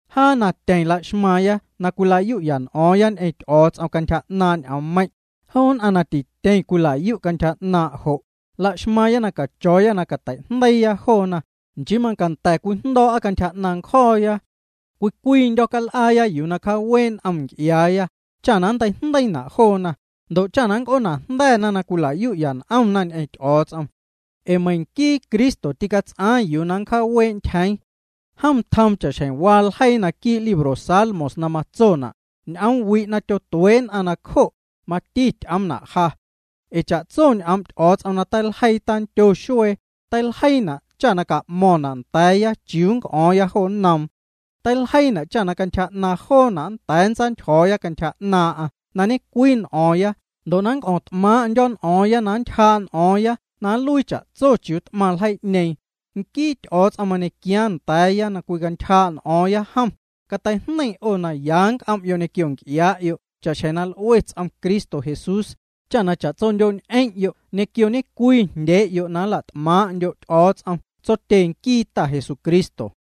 Jaa na tyeⁿ la'xmaaⁿya na cwila'yu'ya n'o̱o̱ⁿya ñ'eⁿ Ty'o̱o̱ts'om cantyja 'naaⁿ' ñ'oommeiⁿ', joo nn'aⁿ na tityeⁿ cwila'yu'na cantyja 'naaⁿ' jo', laxmaaⁿya na cacho̱o̱ya na cateijndeii joona, nchii macanda̱ cwijndo̱o̱'a cantyja 'naaⁿ ncjo̱o̱ya. Cwii cwiindyo̱ cal'aaya yuu na nncjaawee' n'om nc'iaaya, cha nnteijndeiina' joona, ndo' cha na nnc'oonajnda̱na na cwila'yu'ya n'omna ñ'eⁿ Ty'o̱o̱ts'om. Ee meiⁿ nquii Cristo tîcats'aaⁿ yuu na cjaawee' ntyjeeⁿ. Jom tjoom cha'xjeⁿ waa ljeii naquii' libro Salmos na matsona': “Ñ'oomwi' na tyotuee' nn'a nacjo', mati ty'oomna' ja.” Ee cha'tso ñ'oom' Ty'o̱o̱ts'om na teiljeii tandyo xuee, teiljeiina' cha ca'mo̱ⁿna' nda̱a̱ya chiuu na c'o̱o̱ⁿya jo nnoom. Teiljeiina' cha cantyja 'naaⁿ joona' nnda̱a̱ nntsaantyjo̱o̱ya cantyja 'naaⁿ'aⁿ na ñecwii n'o̱o̱ⁿya ndo' na nnc'o̱o̱ⁿt'maaⁿ'ndyo̱ n'o̱o̱ⁿya na nntyjaa' n'o̱o̱ⁿya na nluii cha'tso chiuu t'maⁿ ljeii'ñeeⁿ. Nquii Ty'o̱o̱ts'om na mañequiaaⁿ nda̱a̱ya na cwicantyjaa' n'o̱o̱ⁿya jom, cateijneiⁿ 'o na ya c'om'yo' ñequio nc'iaa'yo' cha'xjeⁿ na l'ue ts'om Cristo Jesús, cha na cha'tsondyo'ñ'eⁿ'yo' ñequio ñecwii jndyee'yo' na nla't'maaⁿ'ndyo' Ty'o̱o̱ts'om Tsotye nquii Ta Jesucristo.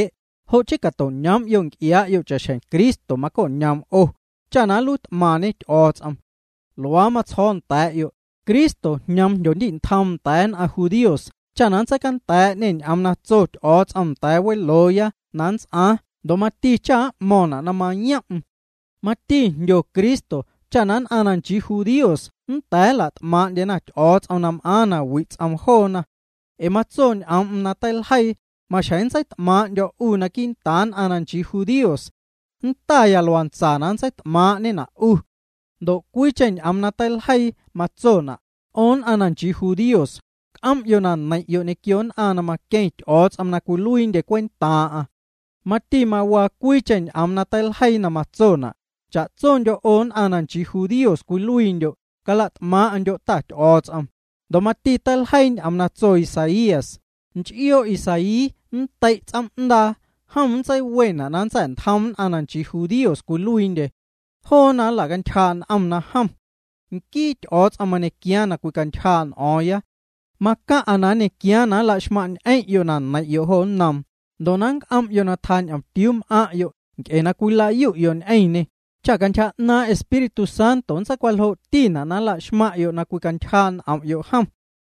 Jo' chii cato'ñoom'yo' nc'iaa'yo' cha'xjeⁿ Cristo maco'ñoom 'o, cha na nluiit'maⁿñe Ty'o̱o̱ts'om. Luaa matsjo̱o̱ nda̱a̱'yo', Cristo jñoom na jndyondi'ntjoom nda̱a̱ nn'aⁿ judíos cha na nntseicanda̱a̱'ñê ñ'oom na tso Ty'o̱o̱ts'om nda̱a̱ welooya na nnts'aaⁿ ndo' mati cha m'mo̱ⁿna' na mayom'm. Mati jndyo Cristo cha nn'aⁿ na nchii judíos nnda̱a̱ nla't'maaⁿ'ndyena Ty'o̱o̱ts'om na m'aaⁿ na wi' ts'oom joona. Ee matso ñ'oom'm na teiljeii: Maxjeⁿ nntseit'maaⁿ'ndyo̱ 'u quii'ntaaⁿ nn'aⁿ na nchii judíos. Nntaya luantsa na nntseit'maaⁿ'ñena' 'u. Ndo' cwiicheⁿ ñ'oom na teiljeii matsona': 'O nn'aⁿ na nchii judíos, c'om'yo' na neiⁿ'yo' ñequio nn'aⁿ na maqueⁿ Ty'o̱o̱ts'om na cwiluiindye cwentaaⁿ'aⁿ. Mati mawaa cwiicheⁿ ñ'oom na teiljeii na matsona': Cha'tsondyo' 'o nn'aⁿ na nchii judíos cwiluiindyo', cala't'maaⁿ'ndyo' Ta Ty'o̱o̱ts'om. Ndo' mati teiljeii ñ'oom na tso Isaías: Nch'ioo' Isaí nndei' ts'oom'ndaa, jom nntseiwena' na nntsa̱'ntjoom nn'aⁿ na nchii judíos cwiluiindye. Joona nla'cantyjaa' n'omna jom. Nquii Ty'o̱o̱ts'om mañequiaaⁿ na cwicantyjaa' n'o̱o̱ⁿya. Macaⁿ'a na nñequiaaⁿ na nla'xmaⁿñ'eⁿ'yo' na neiⁿ'yo' jo nnoom, ndo' na nnc'om'yo' na tjañomtiuu m'aⁿ'yo' nc'e na cwilayu'yo' ñ'eⁿñê, cha cantyja 'naaⁿ' Espíritu Santo nntseicwaljoo'tina' na laxmaⁿ'yo' na cwicantyjaa' n'om'yo' jom.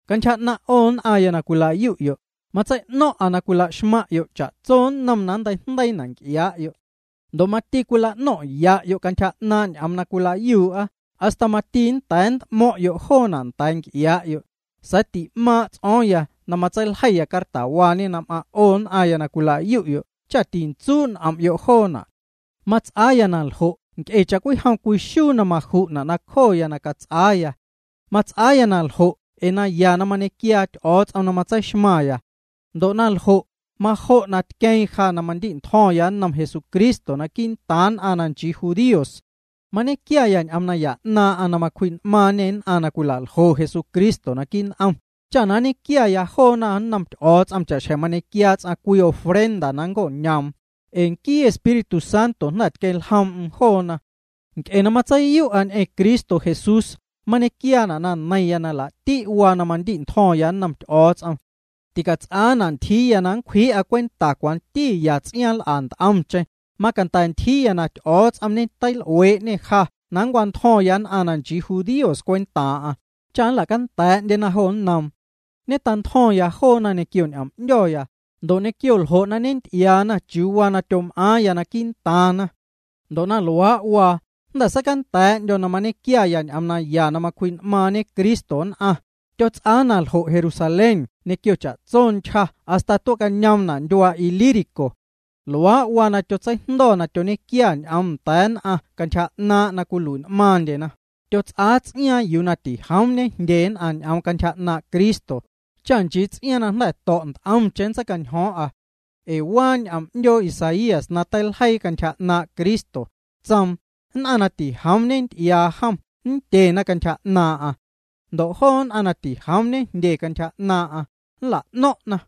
Cantyja 'naⁿ' 'o nn'aⁿya na cwila'yu'yo', matsei'no̱ⁿ'a na cwila'xmaⁿ'yo' cha'tso nnom na nnteijndeiina' nc'iaa'yo'. Ndo' mati cwila'no̱ⁿ'ya'yo' cantyja 'naaⁿ' ñ'oom na cwilayuu'a, hasta mati nnda̱a̱ nnt'mo̱ⁿ'yo' joona' nda̱a̱ nc'iaa'yo'. Sa̱a̱ ti'maaⁿ' ts'o̱o̱ⁿya na matseiljeiya cartawaa na m'aⁿ' 'o nn'aⁿya na cwila'yu'yo' cha tintsuu' n'om'yo' joona'. Mats'aa naljo' nc'e cha'cwijom cwii xuu na maju'na' nacjoya na cats'aaya. Mats'aa na ljo' ee naya na mañequiaa Ty'o̱o̱ts'om na matseixmaⁿ. Ndo' naljo', majo' na tqueeⁿ ja na mandi'ntjo̱ⁿya nnom Jesucristo quii'ntaaⁿ nn'aⁿ na nchii judíos. Mañequiaya ñ'oom naya 'naaⁿ'aⁿ na macwji'n'maaⁿñê nn'aⁿ na cwila'ljo Jesucristo naquii' n'om, cha nñequiaya joona nnom Ty'o̱o̱ts'om cha'xjeⁿ mañequiaa ts'aⁿ cwii ofrenda na nnco'ñoom, ee nquii Espíritu Santo jnda̱ tqueⁿ ljoom'm joona. Nc'e na matseiyu'a ñ'eⁿ Cristo Jesús, mañequiaana' na neiⁿya na laa'ti' waa na mandi'ntjo̱ⁿya nnom Ty'o̱o̱ts'om. Ticats'aana' ntyjii na nncwjii'a cwenta cwanti ya ts'iaaⁿ na nl'a nt'omcheⁿ, macanda̱ ntyjiiya na Ty'o̱o̱ts'om ñeteil'uee'ñê ja na nncwantjo̱ⁿya nn'aⁿ na nchii judíos cwentaaⁿ'aⁿ, cha nla'canda̱a̱'ndyena jo nnoom. Ñetantjo̱ⁿya joona ñequio ñ'om'ndyo̱ya, ndo' ñequio ljo' na ñenty'iaana chiuu waa na tyom'aaⁿya quii'ntaaⁿna. Ndo' na luaa' waa, jnda̱ seicanda̱a̱'ndyo̱ na mañequia ñ'oom naya na macwji'n'maaⁿñe Cristo nn'aⁿ, tyots'aa na ljo' Jerusalén ñequio cha'tso ntyja hasta tue'ñoomna' ndyuaa Ilírico. Luaa' waa na tyotseijndo̱ na tyoñequiaya ñ'oom nda̱a̱ nn'aⁿ cantyja 'naaⁿ' na cwilui'n'maaⁿndyena, tyots'aa ts'iaaⁿ yuu na tijoom ñejndye nn'aⁿ ñ'oom cantyja 'naaⁿ' Cristo, cha nchii ts'iaaⁿ na jnda̱ to̱' nt'omcheⁿ nntseicañjo̱o̱ⁿ'a. Ee waa ñ'oom 'ndyoo Isaías na teiljeii cantyja 'naaⁿ' Cristo, tsoom: Nn'aⁿ na tijoom ñenty'iaa jom nndyena cantyja 'naaⁿ'a. Ndo' joo nn'aⁿ na tijoom ñejndye cantyja 'naaⁿ'aⁿ, nla'no̱ⁿ'na.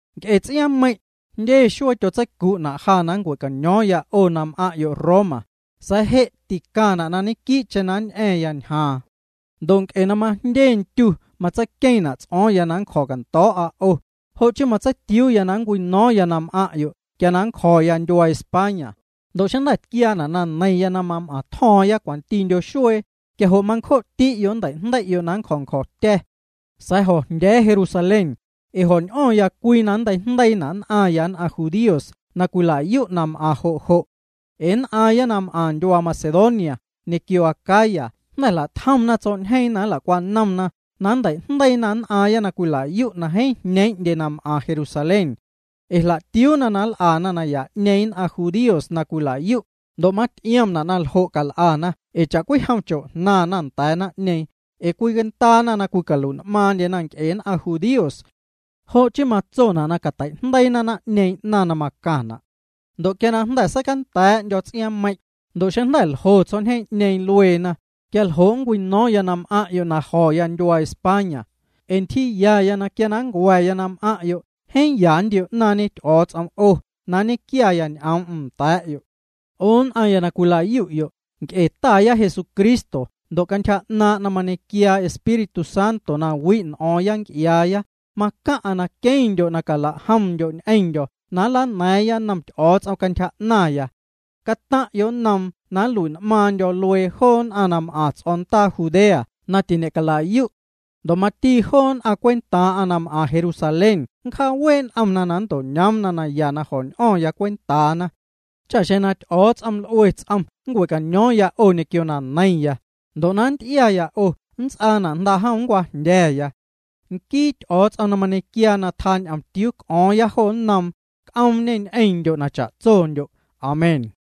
Nc'e ts'iaaⁿmeiⁿ', jndye xuee tyotseicu'na' ja na nncua̱caño̱o̱ⁿya 'o na m'aⁿ'yo' Roma. Sa̱a̱ je' ticaⁿna' na ñequii'cheⁿ nñ'a̱ⁿ ñjaaⁿ. Ndo' nc'e na majndye ndyu matseiqueeⁿna' ts'o̱o̱ⁿya na ñe'cjo̱cando̱o̱'a 'o, jo' chii na matseitiuuya na nncwino̱o̱ⁿya na m'aⁿ'yo' quia na nncjo̱ya ndyuaa España, ndo' xeⁿ jnda̱ tquiaana' na neiⁿya na mam'aaⁿtjo̱o̱ⁿya cwantindyo xuee, quia jo' mancjo'ti'yo' nnteijndei'yo' na nncjo̱ ncjo̱tya̱. Sa̱a̱ jo̱jndya̱a̱ya Jerusalén, ee jo̱n'o̱ⁿya cwii na nnteijndeiina' nn'aⁿya nn'aⁿ judíos na cwila'yu' na m'aⁿ jo' jo'. Ee nn'aaⁿya na m'aⁿ ndyuaa Macedonia ñequio Acaya jnda̱ jla'tjomna tsjo̱'ñjeeⁿ na nla'cwanomna na matei'jndeiina' nn'aaⁿya na cwila'yu' na jeeⁿ jñeeⁿ'ndye na m'aⁿ Jerusalén. Ee jla'tiuuna na nl'a naya'ñeeⁿ nn'aⁿ jndíos na cwilayu', ndo' maty'iomna' na ljo' cal'ana ee cha'cwijom na cho'jnaⁿna nda̱a̱ naⁿ'ñeeⁿ, ee cwicandaana na cwicalui'n'maaⁿndyena nc'e nn'aⁿ judíos. Jo' chii matsona' na catei'jndeiina naⁿ'ñeeⁿ 'naⁿ na macaⁿna'. Ndo' quia na jnda̱ seicanda̱a̱'ndyo̱ ts'iaaⁿmeiⁿ', ndo' xeⁿ jnda̱ ljo tsjo̱'ñjeeⁿ'ñeeⁿ lueena, quia ljo' nncwino̱o̱ⁿya na m'aⁿ'yo' na jo̱ ndyuaa España. Ee ntyjiiyaya quia na nncua̱ya na m'aⁿ'yo', jeeⁿ ya nntio'naaⁿñe Cristo 'o na nñequiaya ñ'oom'm nda̱a̱'yo'. 'O nn'aⁿ na cwila'yu'yo', nc'e Taya Jesucristo ndo' cantyja 'naaⁿ' na mañequiaa Espíritu Santo na wi' n'o̱o̱ⁿya nc'iaaya, macaⁿna' na queⁿndyo' na calajomndyo' ñ'eⁿndyo̱ na nlana̱a̱ⁿya nnom Ty'o̱o̱ts'om cantyja 'naⁿya. Cataⁿ'yo' nnoom na nlui'n'maaⁿndyo̱ luee joo nn'aⁿ na m'aⁿ ts'o̱ndaa Judea na tiñe'cala'yu'. Ndo' mati joo nn'aⁿ cwentaaⁿ'aⁿ na m'aⁿ Jerusalén nncjaawee' n'omna na nnto'ñoomna naya na jo̱ñ'o̱ⁿ cwentaana. Cha xeⁿ na Ty'o̱o̱ts'om l'ue ts'om nncue'caño̱o̱ⁿya 'o ñequio na neiⁿya, ndo' na nnty'iaya 'o nnts'aana' jndaa'jom na nncwajndya̱ya. Nquii Ty'o̱o̱ts'om na mañequiaa na tjaa'naⁿ ñomtiuu cwic'o̱o̱ⁿya jo nnoom, c'oomñê ñ'eⁿndyo' na cha'tsondyo'. Amén.